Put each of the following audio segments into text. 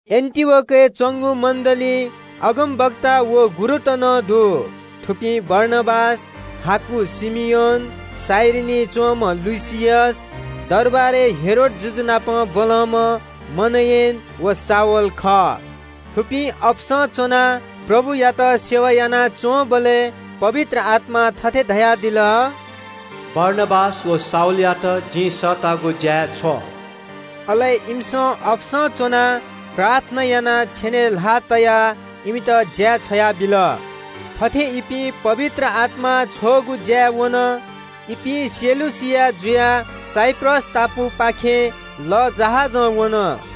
एन्‍टिओखियाय् च्‍वंगु मण्‍डलीइ अगमवक्ता व गुरुत नं दु। थुपिं बारनाबास, हाकु धाःम्‍ह शिमियोन, कुरेनीं वःम्‍ह लुकियस, दरबारय् हेरोद जुजु नाप ब्‍वलंम्‍ह मनेन व शाऊल खः। थुपिं अपसं च्‍वनाः प्रभुया आराधना यानाच्‍वंबलय् पवित्र आत्‍मां थथे धयादिल – “बारनाबास व शाऊलयात जिं सःतागु ज्‍याय् छ्व।” अले इमिसं अपसं च्‍वनाः प्रार्थना यानाः छेनय् ल्‍हाः तयाः इमित ज्‍याय् छ्वयाबिल। थथे इपिं पवित्र आत्‍मां छ्वःगु ज्‍याय् वन। इपिं सिलुकिया जुयाः साइप्रस टापुपाखे लःजहाजं वन।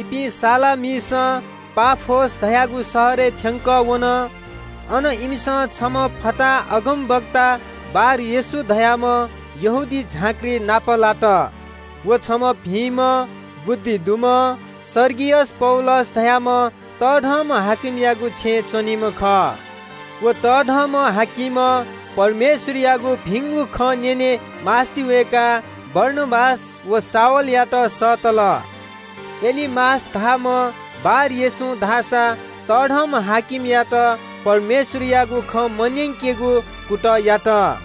इपिं सलामिसं पाफोस धाःगु शहरय् थ्‍यंकः वन। अन इमिसं छम्‍ह फताहा अगमवक्ता बार-येशू धाःम्‍ह यहूदी झाँक्री नापलात। व छम्‍ह बुद्धि दुम्‍ह सर्गियस पौलुस धाःम्‍ह तःधंम्‍ह हाकिमयागु छेँय् च्‍वनीम्‍ह खः। व तःधंम्‍ह हाकिमं परमेश्‍वरयागु भिंगु खँ न्‍यने मास्‍ति वय्‌काः बारनाबास व शाऊलयात सःतल। एलुमास धाःम्‍ह बार-येशूं धाःसा तःधंम्‍ह हाकिमयात परमेश्‍वरयागु खँ मन्‍यंकेगु कुतः यात।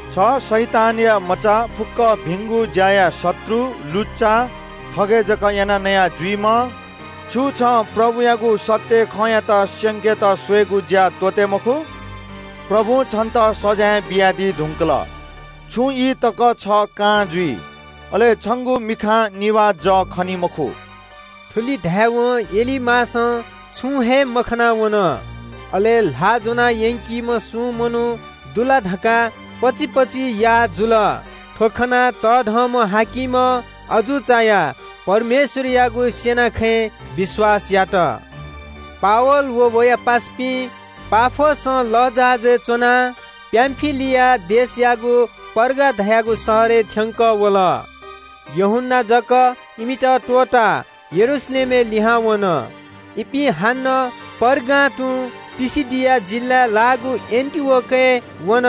“छ शैतानया मचा, फुक्‍क भिंगु ज्‍याया शत्रु, लुच्‍चा, थगय् जक यानाः नया जुइम्‍ह, छु छं प्रभुयागु सत्‍य खँयात स्‍यंकेत स्‍वयेगु ज्‍या त्‍वःते मखु ला? प्रभुं छन्‍त सजाँय बियादी धुंकल। छुं ई तक छ कां जुइ। अले छंगु मिखां निभाः जः खनी मखु।” थुलि धायेवं एलुमासं छुं हे मखना वन। अले ल्‍हाः ज्‍वना यंकीम्‍ह सुं मनू दु ला धकाः पचिपचि याः जुल। थ्‍व खनाः तःधंम्‍ह हाकिमं अजू चायाः परमेश्‍वरयागु स्‍यना खँय् विश्‍वास यात। पावल व वया पासापिं पाफोसं लःजहाजय् च्‍वनाः पामफिलियाय् लाःगु पर्गा धाःगु शहरय् थ्‍यंकः वल। यूहन्‍ना धाःसा इमित अन हे त्‍वःताः यरूशलेमय् लिहां वन। इपिं पर्गां तुं पिसिदिया जिल्‍लाय् लाःगु एन्‍टिओखियाय् वन।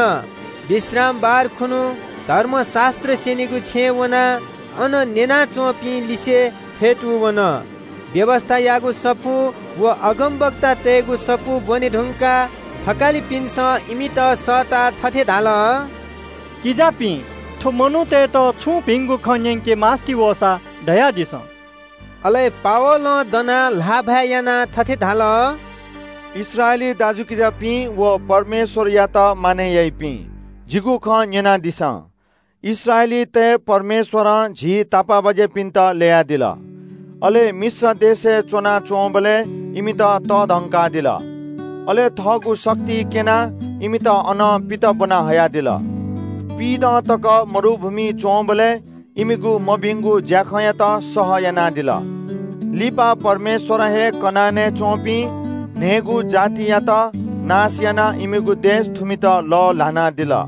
विश्रामबार यहूदीतय् विश्रामबार खुन्‍हु खुन्‍हु धर्मशास्‍त्र स्‍यनीगु छेँय् वनाः अन न्‍यना च्‍वंपिं लिसे फ्‍यतूवन। व्‍यवस्‍थायागु सफू व अगमवक्तातय्‌गु सफू ब्‍वने धुंकाः थकालिपिन्‍सं इमित सःताः थथे धाल – “किजापिं, थ्‍व मनूतय्‌त छुं भिंगु खँ न्‍यंके मास्‍ति वःसा, धयादिसँ।” अले पावलं दनाः ल्‍हाःभाय् यानाः थथे धाल – “इस्राएली दाजुकिजापिं व परमेश्‍वरयात मानय् याइपिं, जिगु खँ न्‍यनादिसँ। “इस्राएलीतय् परमेश्‍वरं झी तापाःबाज्‍यापिन्‍त ल्‍ययादिल, अले मिश्र देशय् च्‍वनाच्‍वंबलय् इमित तःधंकादिल। अले थःगु शक्ति क्‍यनाः इमित अनं पित ब्‍वना हयादिल। पिइदँ तक मरुभूमिइ च्‍वंबलय् इमिगु मभिंगु ज्‍याखँयात सह यानादिल। लिपा परमेश्‍वरं हे कनानय् च्‍वंपिं न्‍हय्‌गू जातियात नाश यानाः इमिगु देश थुमित लःल्‍हानादिल।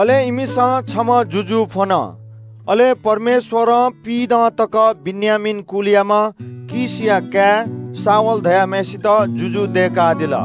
अले इमिसं छम्‍ह जुजु फ्‍वन। अले परमेश्‍वरं पिइदँ तक बेन्‍यामीन कुलयाम्‍ह कीशया काय् शाऊल धाःम्‍हय्‌सित जुजु दय्‌कादिल।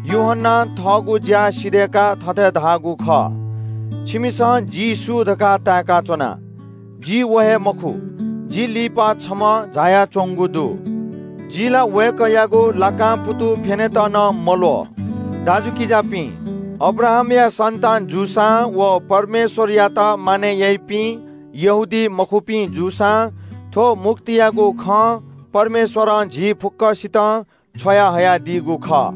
यूहन्‍नां थःगु ज्‍या सिधय्‌काः थथे धाःगु खः – ‘छिमिसं जि सु धकाः ताय्‌का च्‍वना? जि व हे मखु। जि लिपा छम्‍ह झायाच्‍वंगु दु। जि ला वय्‌कःयागु लाकां पुतु फ्‍यनेत नं मल्‍वः।’” “दाजुकिजापिं, अब्राहामया सन्‍तान जूसां वा परमेश्‍वरयात मानय् याइपिं यहूदीमखुपिं जूसां थ्‍व मुक्तियागु खँ परमेश्‍वरं झी फुक्‍कसितं छ्वयाहयादीगु खः।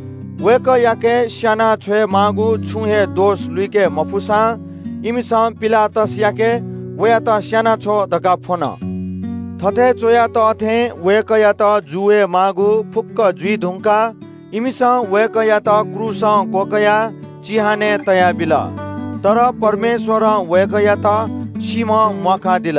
वय्‌कःयाके स्‍याना छ्वयेमाःगु छुं हे दोष लुइके मफुसां इमिसं पिलातसयाके ‘वयात स्‍यानाछ्व’ धकाः फ्‍वन। “थथे च्‍वया तः थें वय्‌कःयात जू वये माःगु फुक्‍क जुइ धुंकाः इमिसं वय्‌कःयात क्रूसं क्‍वकयाः चिहानय् तयाबिल। तर परमेश्‍वरं वय्‌कःयात सीम्‍हं म्‍वाकादिल।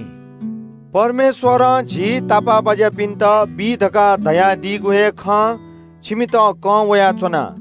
“आः जिमिसं परमेश्‍वरं झी तापाःबाज्‍यापिन्‍त बी धकाः धयादीगु थ्‍व हे भिंगु खँ छिमित कं वयाच्‍वना।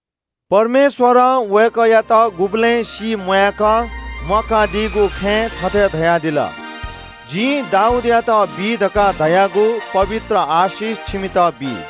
“परमेश्‍वरं वय्‌कःयात गुबलें सीम्‍वाय्‌क म्‍वाकादीगु खँय् थथे धयादिल – “‘जिं दाऊदयात बी धकाः धयागु पवित्र आशिष छिमित बी।’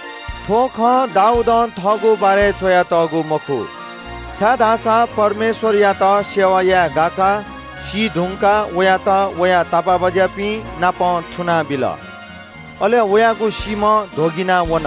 “थ्‍व खँ दाऊदं थःगु बारे च्‍वयातःगु मखु, छाय्‌धाःसा परमेश्‍वरया इच्‍छा कथं सेवा यानाः सीधुंकाः वयात वया तापाःबाज्‍यापिंनापं थुनाबिल। अले वयागु सीम्‍ह ध्‍वगिना वन।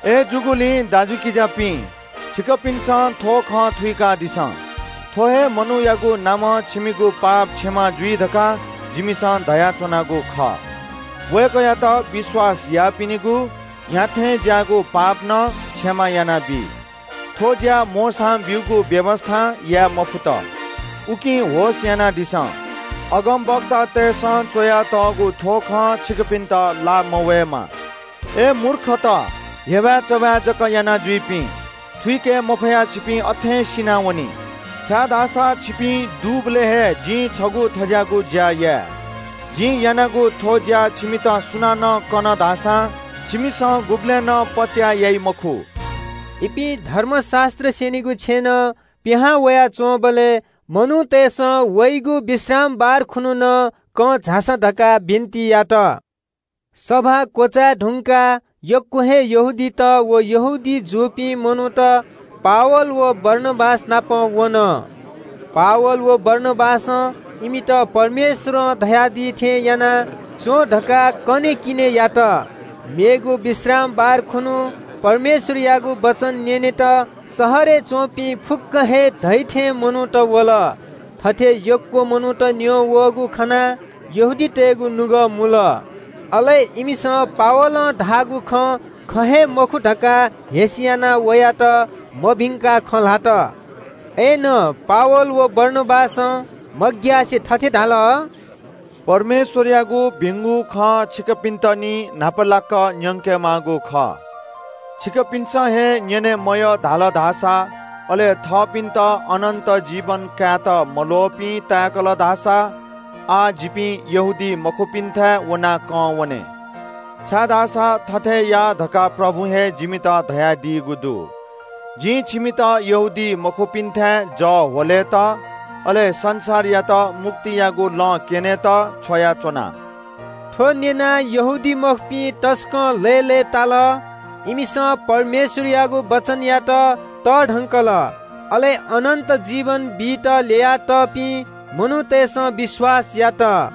“अय्‌जूगुलिं दाजुकिजापिं, छिकपिन्‍सं थ्‍व खँ थुइकादिसँ। थ्‍व हे मनूयागु नामं छिमिगु पाप क्षमा जुइ धकाः जिमिसं धयाच्‍वनागु खः। वय्‌कःयात विश्‍वास याःपिनिगु न्‍ह्याथें ज्‍याःगु पाप नं क्षमा यानाबी। थ्‍व ज्‍या मोशां ब्‍यूगु व्‍यवस्‍थां याये मफुत। उकिं होश यानादिसँ। अगमवक्तातय्‌सं च्‍वयातःगु थ्‍व खँ छिकपिन्‍त लाः मवयेमा – “‘अय् मूर्खत, हेबाय्‌चबाय् जक यानाजुइपिं, थुइके मफयाः छिपिं अथें सिनावनी। छिपिं दुबलय् हे जिं छगू थज्‍याःगु ज्‍या याये। जिं यानागु थ्‍व ज्‍या छिमित सुनानं कन धाःसां छिमिसं गुबलें नं पत्‍याः याइ मखु।’” पावल व बारनाबास धर्मशास्‍त्र स्‍यनीगु छेँनं पिहां वयाच्‍वंबलय् मनूतय्‌सं वइगु विश्रामबार खुन्‍हु नं कं झासँ धकाः बिन्‍ति यात। सभा क्‍वचाय् धुंकाः यक्‍व हे यहूदीत व यहूदी जूपिं मनूत इपिं नाप वन। पावल व बारनाबासं परमेश्‍वरं धयादी थें याना च्‍वँ धकाः इमित बःबियाः धाल। मेगु विश्रामबार खुन्‍हु परमेश्‍वरयागु वचन न्‍यनेत शहरय् च्‍वंपिं अप्‍वः थें मनूत वल। थथे यक्‍व मनूत न्‍यं वःगु खनाः यहूदीतय् नायःतय्‌गु नुगः मुल। अले इमिसं पावलं धाःगु खँ ख हे मखु धकाः हेस्‍यानाः वयात मभिंकाः खँ ल्‍हात। अय्‌नं पावल व बारनाबासं मग्‍यासे थथे धाल – “परमेश्‍वरयागु भिंगु खँ छिकपिन्‍त निं न्‍हापालाक न्‍यंके माःगु खः। छिकपिन्‍सं हे न्‍यने मयः धाल धाःसा, अले थःपिन्‍त अनन्‍त जीवन कायेत मल्‍वःपिं ताय्‌कल धाःसा आः जिपिं यहूदीमखुपिन्‍थाय् वनाः कं वने। छाय्‌धाःसा थथे या धकाः प्रभुं हे जिमित धयादीगु दु – “‘जिं छिमित यहूदीमखुपिन्‍थाय् जः ह्वलेत, अले संसारयात मुक्तियागु लँ क्‍यनेत छ्वयाच्‍वना।’” थ्‍व न्‍यनाः यहूदीमखुपिं तसकं लय्‌लय्‌ताल। इमिसं परमेश्‍वरयागु वचनयात तःधंकल। अले अनन्‍त जीवन बीत ल्‍ययातःपिं मनूतय्‌सं विश्‍वास यात।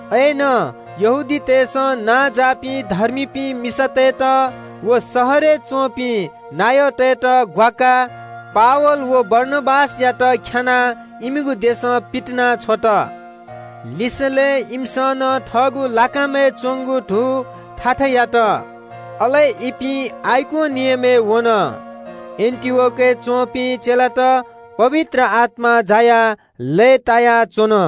अय्‌नं यहूदीतय्‌सं नांजाःपिं धर्मीपिं मिसातय्‌त व शहरय् च्‍वंपिं नायःतय्‌त ग्‍वाकाः पावल व बारनाबासयात ख्‍यानाः इमिगु इलाकां पितिनाछ्वल। अले इपिं थःगु लाकामय् च्‍वंगु धू थाथा यानाः आइकोनियनय् वन। एन्‍टिओखियाय् च्‍वंपिं चेलात पवित्र आत्‍मां जायाः लय्‌तायाच्‍वन।